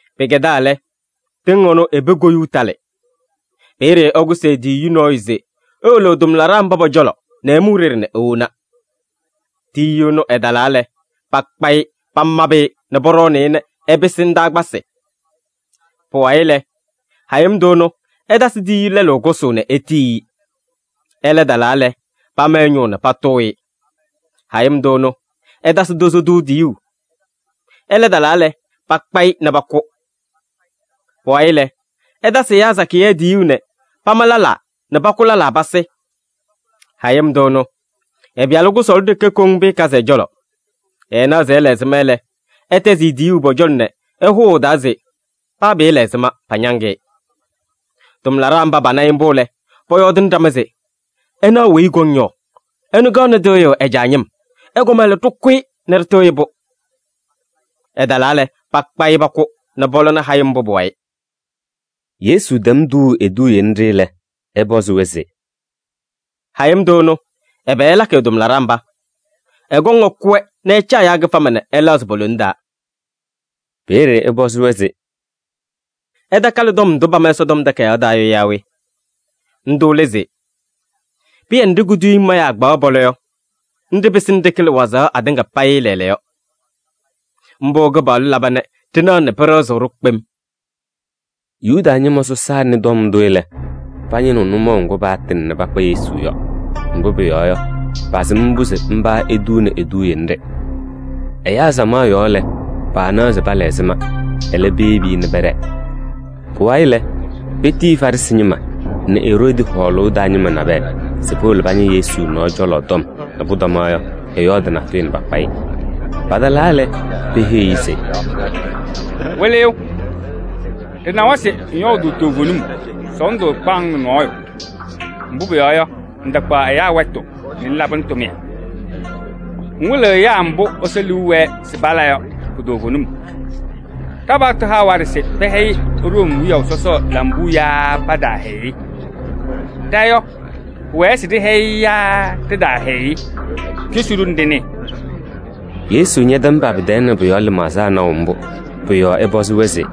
“Pɩkɛdaa lɛ, tɩŋ ɩnʋ i-pee koyuu talɩ. Peeye ɛkʋsɩ e-tiyiyu nɔɔyʋ se ewolo ɛ-tʋmlaɖaa mba pɔ-cɔlɔ nɛ ɛmʋ e-ɖeɖe nɛ ewona. Tiyiyu ɛnʋ ɛtalaa lɛ, pakpa-ɩ pamabɩ-ɩ nɛ pɔɖɔɔnɩ-ɩ nɛ ɛpɩsɩ ndaakpasɩ. Pʋwayɩ lɛ, hayɩm tʋ ɛnʋ ɛtasɩ tiyiyu lɛlʋ kʋsʋʋ nɛ etiyi-i. Ɛlɛ talaa lɛ, pama ɛ-ñʋʋ nɛ patʋʋ-ɩ. Hayɩm tʋ ɛnʋ, ɛtasɩ tozo tʋ tiyuu. Ɛlɛ talaa lɛ, pakpa-ɩ nɛ pakʋ. Pʋwayɩ lɛ, ɛtasɩ ɛyaa sakɩyɛ tiyuu nɛ pama lɛlaa nɛ pakʋ lɛlaa pasɩ. Hayɩm tʋ ɛnʋ, ɛ-pɩyalʋ kʋsɔɔlʋ ɖeke koŋ pɩɩkazɩ ɛ-cɔlɔ. Ɛɛnaɣ se ɛla ɛzɩma lɛ, ɛtɛzɩ-ɩ tiyuu pɔ-cɔlɔ nɛ ɛhʋʋ ɛ-taa se: ‘Paa pɩɩla ɛzɩma, pañaŋ-ɩ.’ Tʋmlaɖaa mba pana-ɩ mbʋ lɛ, pɔyɔɔdɩnɩ ɖama se: ‘Ɩnaɣ weyi ɛkɔŋ yɔ, ɛnʋ kaɣnɩ tɩɣyʋʋ ɛ-caa ñɩm. Ɛkɔma lɛ, ɖɩkʋ-ɩ nɛ ɖɩtɩɣyɩ-pʋ!’ Ɛtalaa lɛ, pakpa-ɩ pakʋ nɛ pɔlɔnɩ hayɩm mbʋ pʋ-wayɩ.” Yesu tɛm tuuu eduuye nɖɩ lɛ, ɛpɔzɩ-wɛ se: “Hayɩm tʋ ɛnʋ, ɛbɛ ɛlakɩ ɛ-tʋmlaɖaa mba? Ɛkɔŋ ɛkʋ-wɛ nɛ ɛcaa ɛyaa kɩfama nɛ ɛlɛɣzɩ po-lone taa.” Peeye ɛpɔzɩ-wɛ se: “Ɩtakalɩ tɔm ndʋ pama Ɛsɔtɔm Takayaɣ taa yɔ yaa we? Ndʋ lɛ se: ‘Pɩyɛ nɖɩ kuduyiŋ mayaa kpaɣaɣ pɔlɔ yɔ, nɖɩ pɩsɩnɩ ɖɩkɩlɩ wazaɣ atɩŋa payɩ lɛɛlɛɛyɔ. Mbʋ Kɩpaɣlʋ laba nɛ ɖɩnaɣ nɛ pɩɖɩɣzɩɣ-ɖʋ kpem!’” Yuda ñɩma sɔsaa nɩ tɔm ndʋ lɛ, pañɩnɩɣ nʋmɔʋ ŋgʋ paatɩŋ nɛ pakpa Yesu yɔ. Mbʋ pʋyɔɔ yɔ, pasɩm mbʋ se mba etuuni eduuye nɖɩ. Ɛyaa samaɣ yɔɔ lɛ, paanaɣ se pala ɛzɩma. Ɛlɛ, peyebi-i nɛ pɛɖɛɛ. Pʋwayɩ lɛ, petiyi Farɩsɩ ñɩma nɛ Eroodi hɔɔlʋʋ taa ñɩma nabɛyɛ se powolo pañɩ Yesu nɔɔ cɔlɔ tɔm nɛ pʋtɔma yɔ, ɛyɔɔdɩ natʋyʋ nɛ pakpa-ɩ. Patalaa lɛ, peheyi-i se: “Wɩlɩyʋ! Ɖɩnawa se ŋyɔɔdʋʋ toovenim, sɔɔndʋ ɛɛkpaɣ-ŋ nɛ nɔɔyʋ. Mbʋ pʋyɔɔ yɔ, ŋtakpaɣ ɛyaa wɛtʋ nɛ ŋlabɩnɩ tʋmɩyɛ. Ŋwɩlɩɣ ɛyaa mbʋ Ɛsɔ liu wɛɛ se pala yɔ pu-toovenim. Ɖa-paɣtʋ haɣ waɖɛ se pɛhɛyɩ Room wiyaʋ sɔsɔ lambuu yaa pataahɛyɩ-ɩ? Ɖa yɔ, pʋwɛɛ se ɖɩhɛyɩ-ɩ yaa ɖɩtaahɛyɩ-ɩ? Cosi-ɖʋ nɛ ɖɩnɩɩ.” Yesu ñɛtɛm pa-pɩ-tɛɛ nɛ pʋ-yɔɔ lɩmaɣza naʋ mbʋ. Pʋ-yɔɔ ɛpɔzɩ-wɛ se: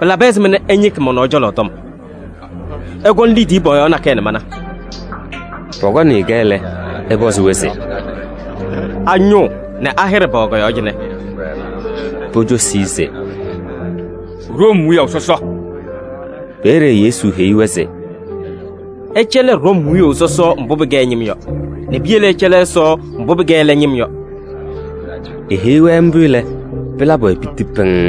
“Pɩlabɩ ɛzɩma nɛ ɩñɩkɩ mɔ-nɔɔ cɔlɔ tɔm? Ɩkɔnɩ liidiye pɔɔyaɣ nakɛyɛ nɛ mana.” Pɔkɔnɩ-kɛ lɛ, ɛpɔzɩ-wɛ se: “A-ñʋʋ nɛ a-hɩɖɛ pɛwɛ kɔ-yɔɔ cɩnɛ?” Pocosi-i se: “Room wiyaʋ sɔsɔ.” Peeye Yesu heyi-wɛ se: “Ɩcɛlɩ Room wiyaʋ sɔsɔ mbʋ pɩkɛ ɛ-ñɩm yɔ nɛ piyele ɩcɛlɩ Ɛsɔ mbʋ pɩkɛ ɛlɛ ñɩm yɔ.” Eheyi-wɛ mbʋ lɛ, pɩlabɩ-wɛ piti pɩŋŋ.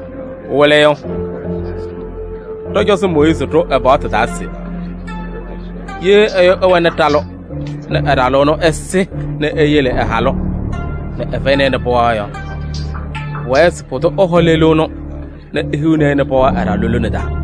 “Wɩlɩyʋ, ɖɔ-cɔzɔ Mooyiizi ɖʋ ɛ-paɣtʋ taa se: ‘Ye ɛyʋ ɛwɛnɩ ɖalʋ nɛ ɛ-ɖalʋ ɛnʋ ɛsɩ nɛ eyele ɛ-halʋ nɛ ɛfɛyɩnɩ-ɩ pɩɣa yɔ, pʋwɛɛ se pʋdʋ ɛhɔ lelu ɛnʋ nɛ ehiɣni-i pɩɣa ɛ-ɖalʋ lone taa.’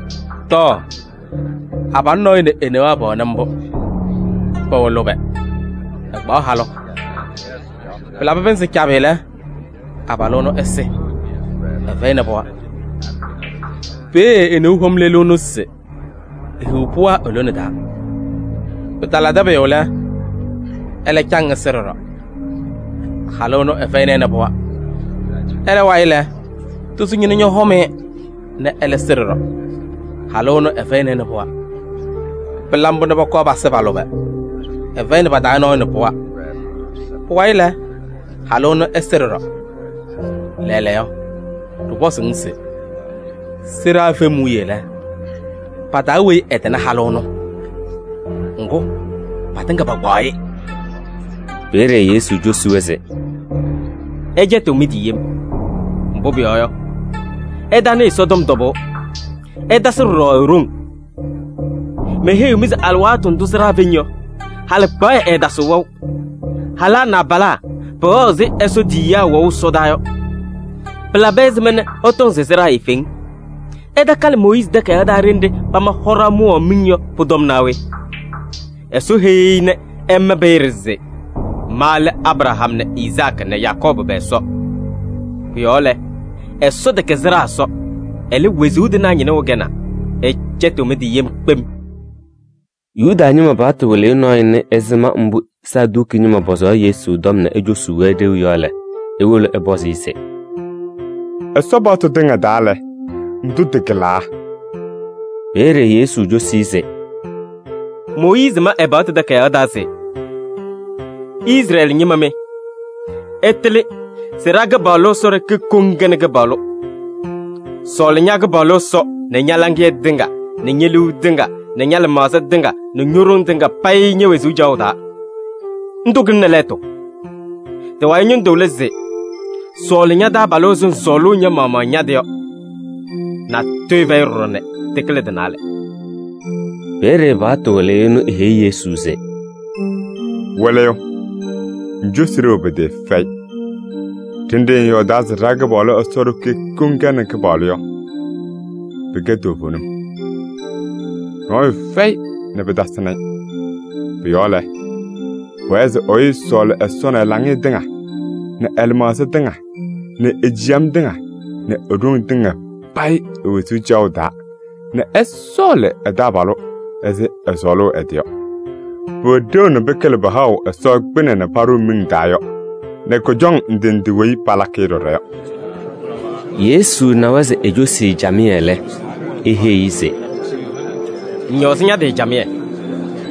Tɔɔ! Abalʋ nɔɔyʋ nɛ e-newaa pɛwɛnɩ mbʋ, pɛwɛ lʋbɛ, ɛkpaɣ halʋ. Pɩlabɩ pɩnzɩ cabɩ lɛ, abalʋ ɛnʋ ɛsɩ, ɛfɛyɩnɩ pɩɣa. Peeye e-neu hɔm lelu ɛnʋ se ehiɣ pɩɣa e-lone taa. Pɩtalabɩdɩ pʋyʋ lɛ, ɛlɛ caŋ ɛsɩ ɖɔɖɔ, halʋ ɛnʋ ɛfɛyɩnɩ-ɩ pɩɣa. Ɛlɛ wayɩ lɛ, tozo tʋ ñɔhɔm-ɩ nɛ ɛlɛ sɩ ɖɔɖɔ. Halʋ ɛnʋ ɛfɛyɩnɩ-ɩ pɩɣa. Pɩla mbʋ nɛ pɔkɔɔ pasɩ pa-lʋbɛ. Ɛfɛyɩnɩ pa-taa nɔɔyʋ nɛ pɩɣa. Pʋwayɩ lɛ, halʋ ɛnʋ ɛsɩ ɖɔɖɔ. Lɛɛlɛɛyɔ, ɖɩpɔzʋʋ-ŋ se: sɩɖaa fem wiye lɛ, pa-taa weyi ɛtɩnɩ halʋ ɛnʋ? Ŋgʋ patɩŋa pakpaɣ-ɩ!” Peeye Yesu cosi-wɛ se: “Ɩcɛtɩɣ mɩ-tɩ yem, mbʋ pʋyɔɔ yɔ, ɩtanɩɩ Ɛsɔtɔm tɔbʋʋ, ɩtasɩ ɖɔɖɔ e-ɖoŋ. Meheyiɣ-mɩ se alɩwaatʋ ndʋ sɩɖaa feŋ yɔ, halɩkpaɣyɛ ɛɛtasɩɣ wɛʋ. Halaa nɛ abalaa pɛwɛɣ ɛzɩ Ɛsɔ tiyiyaa wɛʋ ɛsɔdaa yɔ. Pɩlabɩ ɛzɩma nɛ ɩtɔŋ se sɩɖaa eefeŋ? Ɩtakalɩ Mooyiizi takayaɣ taa ɖenɖe pama hɔɖaɣ mʋwaɣ miŋ yɔ pʋ-tɔm naa we? Ɛsɔ heyi-i nɛ ɛma peeye se: ‘Ma lɛ Abraham nɛ Izaakɩ nɛ Yakɔɔbʋ pɛ-Ɛsɔ.’ Pʋ-yɔɔ lɛ, Ɛsɔ tɛkɛ sɩɖaa Ɛsɔ, ɛlɛ, wezuu tɩnaa ñɩnʋ ɛkɛnaa. Ɩcɛtɩɣ mɩ-tɩ yem kpem.” Yuda ñɩma paɣtʋ wɩlɩyʋ nɔɔyʋ nɩ ɛzɩma mbʋ Saduki ñɩma pɔzaɣ Yesu tɔm nɛ ecosuu-wɛ ɖeu yɔ lɛ, ewolo ɛpɔzɩ-ɩ se: “Ɛsɔ paɣtʋ tɩŋa taa lɛ, ndʋ tɩkɩlaa?” Peeye Yesu cosi-i se: “Mooyiizi ma ɛ-paɣtʋ takayaɣ taa se: ‘Izrɛɛlɩ ñɩma mɩ, ɩtɩlɩ se ɖa-Kɩpaɣlʋ Ɛsɔ ɖeke koŋ kɛnɩ Kɩpaɣlʋ. Sɔɔlɩ ña-Kɩpaɣlʋ Ɛsɔ nɛ ña-laŋɩyɛ tɩŋa nɛ ñe-liu tɩŋa nɛ ña-lɩmaɣza tɩŋa nɛ ño-ɖoŋ tɩŋa payɩ ñe-wezuu caɣʋ taa.’ Ndʋ kɩlɩnɩ lɛɛtʋ. Tɩ-wayɩ ñɩndʋ lɛ se: ‘Sɔɔlɩ ña-taabalʋ ɛzɩ ŋsɔɔlʋʋ ña-maɣmaɣ ña-tɩ yɔ.’ Natʋyʋ fɛyɩ ɖɔɖɔ nɛ tɩkɩlɩ tɩ-naalɛ.” Peeye paɣtʋ wɩlɩyʋ ɛnʋ eheyi Yesu se: “Wɩlɩyʋ! Ŋcosi ɖeu pɩtɩɩfɛyɩ. Ɖenɖe ŋyɔɔdaa se ɖa-Kɩpaɣlʋ Ɛsɔ ɖeke koŋ kɛnɩ Kɩpaɣlʋ yɔ, pɩkɛ toovenim. Nɔɔyʋ fɛyɩ nɛ pɩtasɩnɩ-ɩ. Pʋ-yɔɔ lɛ, pʋwɛɛ se ɛyʋ ɛsɔɔlɩ Ɛsɔ nɛ ɛ-laŋɩyɛ tɩŋa nɛ ɛ-lɩmaɣza tɩŋa nɛ e-ciyam tɩŋa nɛ e-ɖoŋ tɩŋa payɩ e-wezuu caɣʋ taa nɛ ɛsɔɔlɩ ɛ-taabalʋ ɛzɩ ɛsɔɔlʋʋ ɛ-tɩ yɔ. Pʋwɛ ɖeu nɛ pɩkɩlɩ pahaɣʋ Ɛsɔ kpɩnɛ nɛ paɖʋʋ miŋ taa yɔ nɛ kʋjɔŋ ndɩ ndɩ weyi palakɩ-ɩ ɖɔɖɔ yɔ.” Yesu nawa se ecosi-i camɩyɛ lɛ, eheyi-i se: “Ŋñɔɔzɩ ña-tɩ camɩyɛ,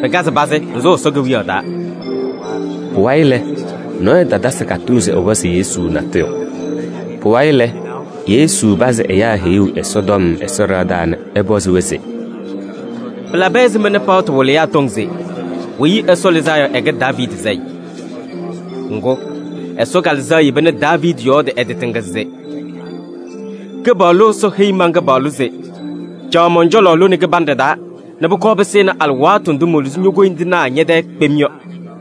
pɩkazɩ pazɩ, ŋsʋʋ Ɛsɔ Kewiyaɣ taa.” Pʋwayɩ lɛ, nɔɔyʋ tatasɩ katʋʋ se ɛpɔzɩ Yesu natʋyʋ. Pʋwayɩ lɛ, Yesu pazɩ ɛyaa heyuu Ɛsɔtɔm Ɛsɔ ɖɩɣa taa nɛ ɛpɔzɩ-wɛ se: “Pɩlabɩ ɛzɩma nɛ paɣtʋ wɩlɩyaa tɔŋ se Weyi Ɛsɔ Lɩzaa Yɔ ɛkɛ Daaviidi sayɩ? Ŋgʋ, Ɛsɔ Kalɩzaɣ yeba nɛ Daaviidi yɔɔdɩ ɛ-tɩ tɩŋa se: ‘Kɩpaɣlʋ Ɛsɔ heyi man-Kɩpaɣlʋ se: caɣ mɔn-cɔlɔ lone kɩbanɖɛ taa nɛ pʋkɔɔ pɩsɩnɩ alɩwaatʋ ndʋ moluzi ño-koyindinaa ñɛ-tɛɛ kpem yɔ.’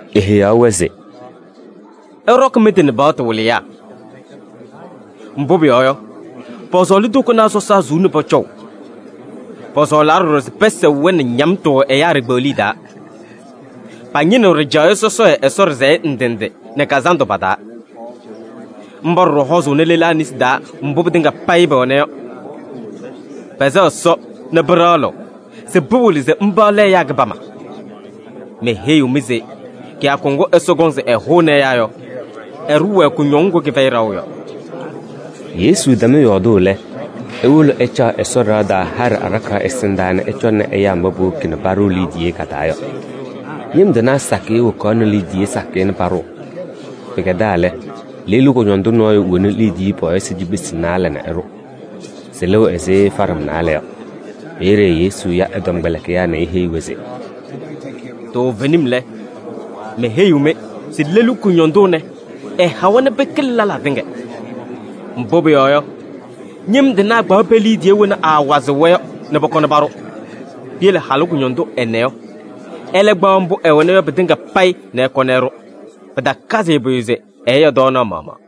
Eheyaɣ-wɛ se: “Ɩɖɔkɩ mɩ-tɩ nɛ paɣtʋ wɩlɩyaa. Mbʋ pʋyɔɔ yɔ, pɔsɔɔlɩ tokonaa sɔsaa suu nɛ pɔcɔʋ. Pɔsɔɔlaa ɖɔɖɔ se pɛsɛɣ-wɛ nɛ ñamtʋ ɛyaa ɖikpeɣliye taa. Pañɩnɩɣ ɖɩjaɣyɛ sɔsɔɖɛ Ɛsɔ ɖɩsɛyɛ ndɩ ndɩ nɛ kazandʋ pa-taa. Mba ɖɔɖɔ hɔɔzʋʋnɩ lelaa nesi taa mbʋ pɩtɩŋa payɩ pɛwɛna yɔ. Pɛsɛɣ Ɛsɔ nɛ pɩɖaɣlɩɣ se pɩwɩlɩ se mba lɛ ɛyaa kɩbama. Meheyiɣ-mɩ se kɩyakʋ ŋgʋ Ɛsɔ kɔŋ se ɛhʋnɩ ɛyaa yɔ, ɛɖʋʋ-wɛ kʋñɔŋ ŋgʋ kɩfɛyɩ ɖaɣʋ yɔ.” Yesu tɛm yɔɔdʋʋ lɛ, ewolo ɛcaɣ Ɛsɔ ɖɩɣa taa haɖɛ aɖakaɣ ɛsɩndaa nɛ ɛcɔŋnɩ ɛyaa mba powoki paɖʋʋ liidiye ka-taa yɔ. Ñɩm tɩnaa sakɩyɛ wokaɣnɩ liidiye sakɩyɛ nɛ paɖʋʋ. Pɩkɛdaa lɛ, lelu kʋñɔndʋ nɔɔyʋ ñowoni liidiye pɔɔyɩsɩ cikpesi naalɛ nɛ ɛɖʋ. Sɩlɩɣ ɛzɩ faɖam naalɛ yɔ. Peeye Yesu ya ɛ-tɔmkpɛlɩkɩyaa nɛ eheyi-wɛ se: “Toovenim lɛ, meheyiɣ-mɩ se lelu kʋñɔndʋ ɛnɛ, ɛhawa nɛ pɩkɩlɩ lɛlaa tɩŋa. Mbʋ pʋyɔɔ yɔ, ñɩm tɩnaa kpaɣ pe-liidiye wena aawazɩɣ-wɛ yɔ nɛ pɔkɔnɩ paɖʋ. Piyele halʋ kʋñɔndʋ ɛnɛ yɔ, ɛlɛ kpaɣ mbʋ ɛwɛna yɔ pɩtɩŋa payɩ nɛ ɛkɔnɩ ɛɖʋ. Pɩtakazɩ-ɩ pʋyʋ se ɛɛya tɔɔnaɣ maɣmaɣ.”